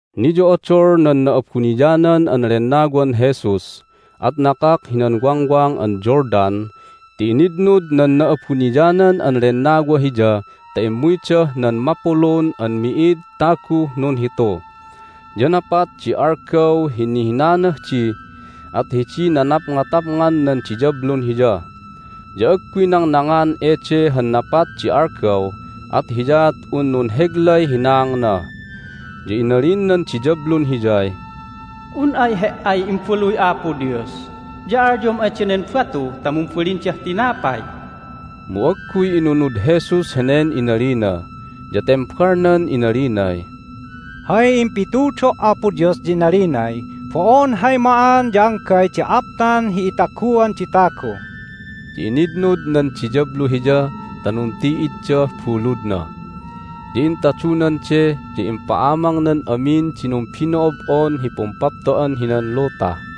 Niyo'odol nan Na'abuniyanan an Lennawan Jesus, at nakak hinan Wangwang an Jordan ti initnud nan Na'abuniyanan an Lennawa Hiya ta immuydah nan mapulun an mi'id taguh nunhitu. Ya napat di algaw hi nihinanah di, at hidiy nanapngatapngan nan diyablun Hiya. Ya agguy nangnangngan ede han napat di algaw, at hiyaat un nunheglay hinaangna. Ya inalin nan diyablun Hiyay, "Un ay He"ay Imbaluy Apo Dios ya alyom ay danen batu ta mumbalindah tinapay!" Mu agguy inunud Jesus henen inalina, ya tembalnan inalinay, "Hay impitudo' Apo Dios ya inalinay, Bo'on hay ma'an ya anggay di aptan hi itaguan di tagu." Ya initnud nan diyablu Hiya ta nunti'iddah buludna, ya intadunan de, ya impa'amangnan amin di numbino'ob'on hi pumpapto'an hinan luta,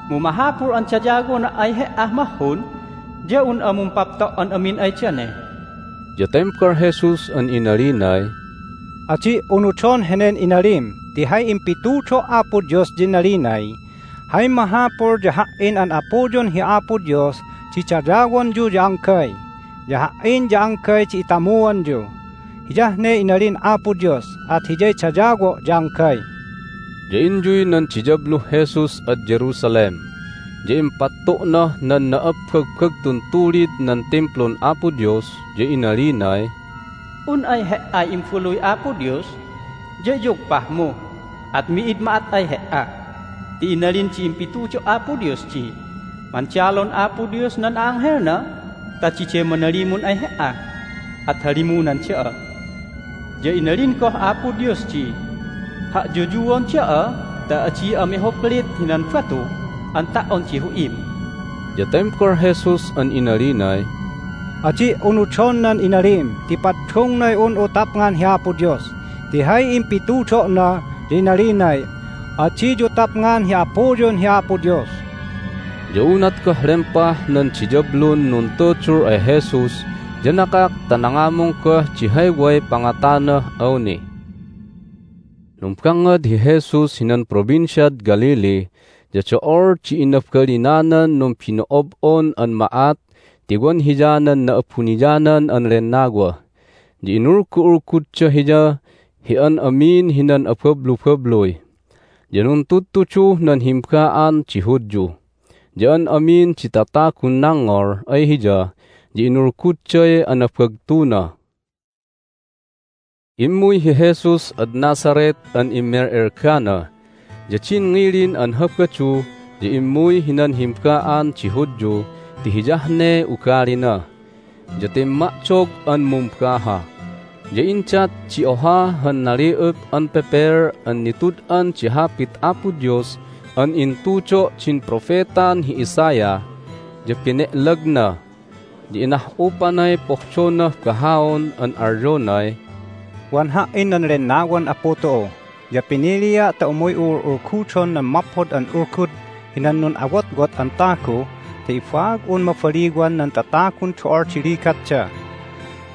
Mu mahapul an dayawona' ay He"ah mahhun ya un'a mumpapto' an amin ay dane." Ya tembal Jesus an inalinay, "Adi' unudon henen inalim ti hay impitudo' Apo Dios ya inalinay, Hay mahapul ya Ha"in an Apuyun hi Apo Dios di dayawonyu ya anggay, ya Ha"in ya anggay di itamuanyu. Hiyah ne inalin Apo Dios, at Hiyay dayawo' ya anggay." Ya inyuy nan diyabluh Jesus ad Jerusalem, ya impattu'nah nan na'abbagbagtun tulid nan Timplun Apo Dios, ya inalinay, "Un ay He"ay Imbaluy Apo Dios ya iyugpahmu at mi'id ma'at ay He"a. Ti inalin di impitudo' Apo Dios di, Mandalon Apo Dios nan a'anghelna ta diday manalimun ay He"a, at halimunan da'a. Ya inalin goh Apo Dios di, Ha'yuyuon da'a ta adi'a mihuplit hinan batu an ta"on di hu'im." Ya tembal Jesus an inalinay, "Adi' unudon nan inalim ti paddungnay un'u tapngan hi Apo Dios! Ti hay impitudo'na ya inalinay, Adiyu tapngan hi Apuyun hi Apo Dios." Ya unat goh lempah nan diyablun nuntudul ay Jesus ya nakak ta nangamung goh di hay way pangatanah awni. Numbangngad hi Jesus hinan Provinciad Galilee, ya do'ol di inabalinanan numbino'ob'on an ma'at ti wan Hiya nan Na'abuniyanan an Lennawa. Ya inulgu'ulgudda Hiya hi an amin hinan abablubabluy. Ya nuntudtuduh nan himba'an di Hudyu, ya an amin di tatagun nangngol ay Hiya ya inulgudday anabagtuna. Immuy hi Jesus ad Nazareth an immel'elgana, ya din ngilin an Habadu ya immuy hinan himba'an di Hudyu ti hiyah ne ugalina. Ya timma'dog an mumbaha, ya indat di oha han nali'up an pepel an nitud'an di Hapit Apo Dios an intudo' din propetan hi Isaiah. Ya bene'lagna, ya inah'upanay pohdonah bahaon an alyonay, "Wan Ha"in nan Lennawan Apu tu'u. Ya pinilia' ta umuy'u ul'ulgudon nan Maphod an Ulgud hinan nun'awotwot an tagu ta ibaag'un mabaliwan nan tatagun do'ol di ligatda.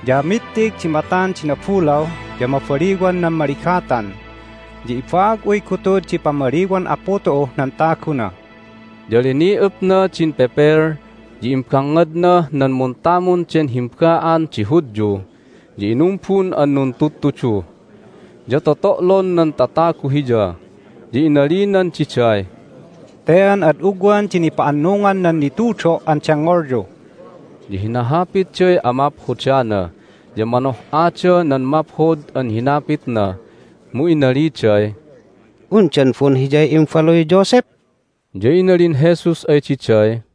Ya mittig di matan di nabulaw, ya mabaliwan nan maligatan, ya ibaag'uy gutud di pamaliwan Apu tu'uh nan taguna!" Ya lini'upna din pepel, ya imbangngadnah nan muntamun den himba'an di Hudyu, ya inumbun an nuntudtudu. Ya toto'lon nan tatagu Hiya. Ya inalinan diday, "Te an ad ugwan di nipa'annungan nan nitudo' an dengngolyu!" Ya hinahapitday amaphodana, ya manoh'adah nan maphod an hinapitna. Mu inaliday, "Undan bo'on Hiyay imbaluy Joseph?" Ya inalin Jesus ay diday,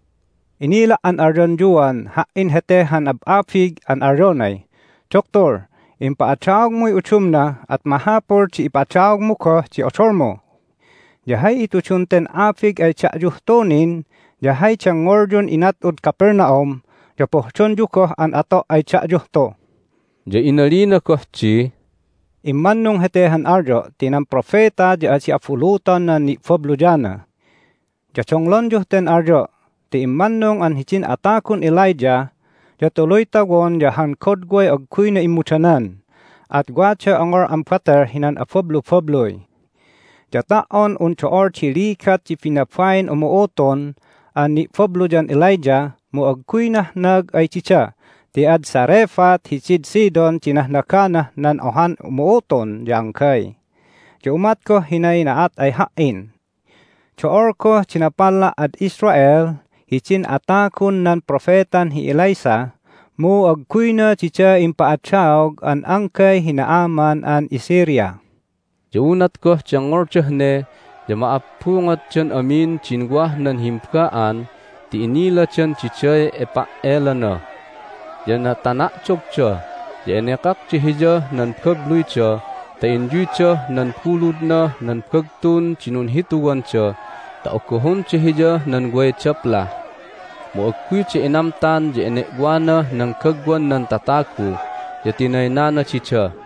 "Inila' an alyonyuan Ha"in hete han ab'abig an alyonay, Duktul, impa'adaogmuy udumna, at mahapul di ipa'adaogmu goh di odolmu! Ya hay itudun ten abig ay da'yuh tu nin ya hay dengngolyun inat'ud Capernaum ya pohdonyu goh an ato' ay da'yuh tu." Ya inalina goh di, "Immannung hete han alyo' ti nan propeta ya adi abuluton nan ni'babluyana. Ya donglonyuh ten alyo' ti immannung an hidin atagun Elijah ya tuluy tawon ya han godway agguyna immudanan, at waday ongol an batel hinan abablubabluy. Ya ta"on un do'ol di ligat di binabain umu'utun an ni'babluyan Elijah mu agguy nahnag ay dida ti ad Zarephath hidid Sidon di nahnaganah nan ohan umu'utun ya anggay. Ya umat goh hinay na'at ay Ha"in. Do'ol goh di napalla' ad Israel hidin atagun nan propetan hi Elisha, mu agguyna dida impa'adaog an anggay hi Naaman an iSyria." Ya unat goh dengngoldah ne ya ma'abbungotdan amin din wah nan himba'an ti iniladan diday ipa"elana. Ya natana'dogda, ya enekakda Hiyah nan babluyda ta inyuydah nan buludnah nan bagtun di nunhituwanda ta ogohonda Hiyah nan way daplah. Mu agguyda inamtan, ya ene'wanah nan gagwan nan tatagu, ya tinaynana dida.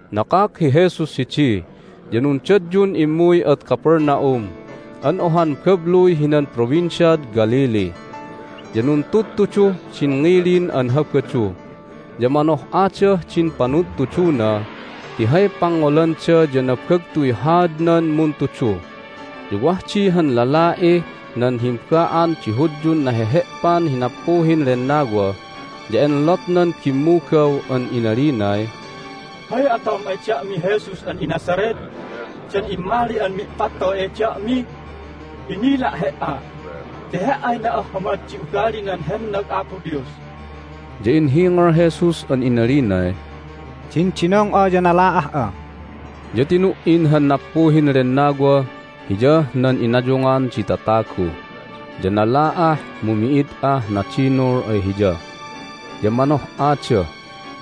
Nakak hi Jesus hidi, ya nundadyun immuy ad Capernaum an ohan babluy hinan Provinciad Galilee, ya nuntudtuduh din ngilin an Habadu. Ya manoh'adah din panudtuduna ti hay pangngolanda ya nabagtuy haadnan muntudu. Ya wah di han lala'ih nan himba'an di Hudyun nahehe'pan hi nappuhin lennawa, ya enlotnan bimmugaw an inalinay, "Hay atom ay da'mi, Jesus an iNazareth? Dan immali'an mi'pattoy ay da'mi? Inila' He"a ti He"ay na'ahhamad di ugalinan hennag Apo Dios!" Ya inhingal Jesus an inalinay, "Dindinong'a, ya nala'ah'a!" Ya tinu"in han nappuhin lennawa hiyah nan inayungan di tatagu, ya nala'ah, mu mi'id ah nadinul ay hiya. Ya manoh'ada,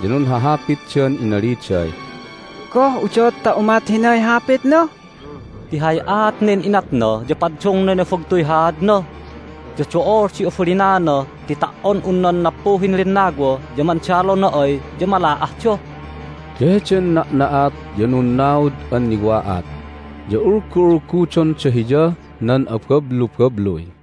ya nunhahapitdan inaliday, "Goh udot ta umat hinay hapitna? Ti hay aat nen inatna ya paddungnay nabagtuy haadna, ya do'ol di abalinana ti ta"on un nan nappuhin lennawa ya mandalona ay ya mala'ahda." Ya heden na'na'at ya nunnaud an niwa'at, ya ulgu'ulgudonda Hiyah nan abablubabluy.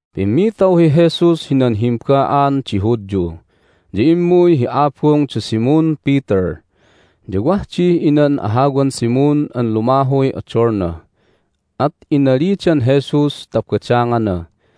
Pimmitaw hi Jesus hinan himba'an di Hudyu, ya immuy hi abung da Simon Peter. Ya wah dih inan ahawan Simon an lumahuy odolna, at inalidan Jesus ta badangana.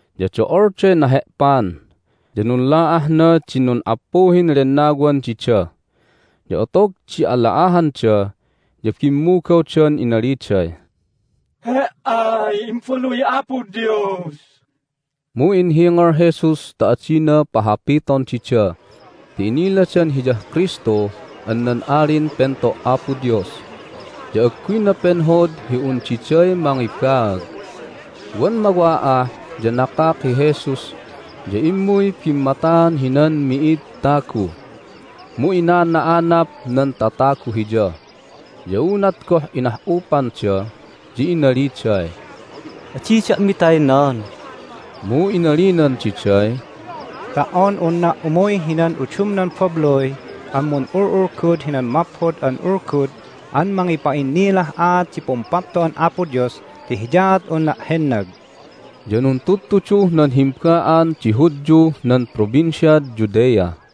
Ya do'olday nahe'pan, ya nunla'ahna din nun'appuhin lennawan dida. Ya otog di ala'ahanda ya bimmugawdan inaliday, "He"ay Imbaluy Apo Dios!" Mu inhingal Jesus ta adina pahapiton dida ti iniladan Hiyah Kristu an nan Alin Pento' Apo Dios, ya agguyna penhod hi un diday mangibaag. Wan mawa'ah ya nakak hi Jesus, ya immuy bimmataan hinan mi'id tagu. Mu inana'anap nan tatagu Hiya. Ya unat goh inah'upanda ya inaliday, "Adi da'mi taynan!" Mu inalinan diday, "Ta"on unna' umuy hinan udumnan babluy an mun'ul'ulgud hinan Maphod an Ulgud an mangipa'innilah aat di Pumpapto'an Apo Dios ti hiyaat unna' hennag." Ya nuntudtuduh nan himba'an di Hudyuh nan Provinciad Judea.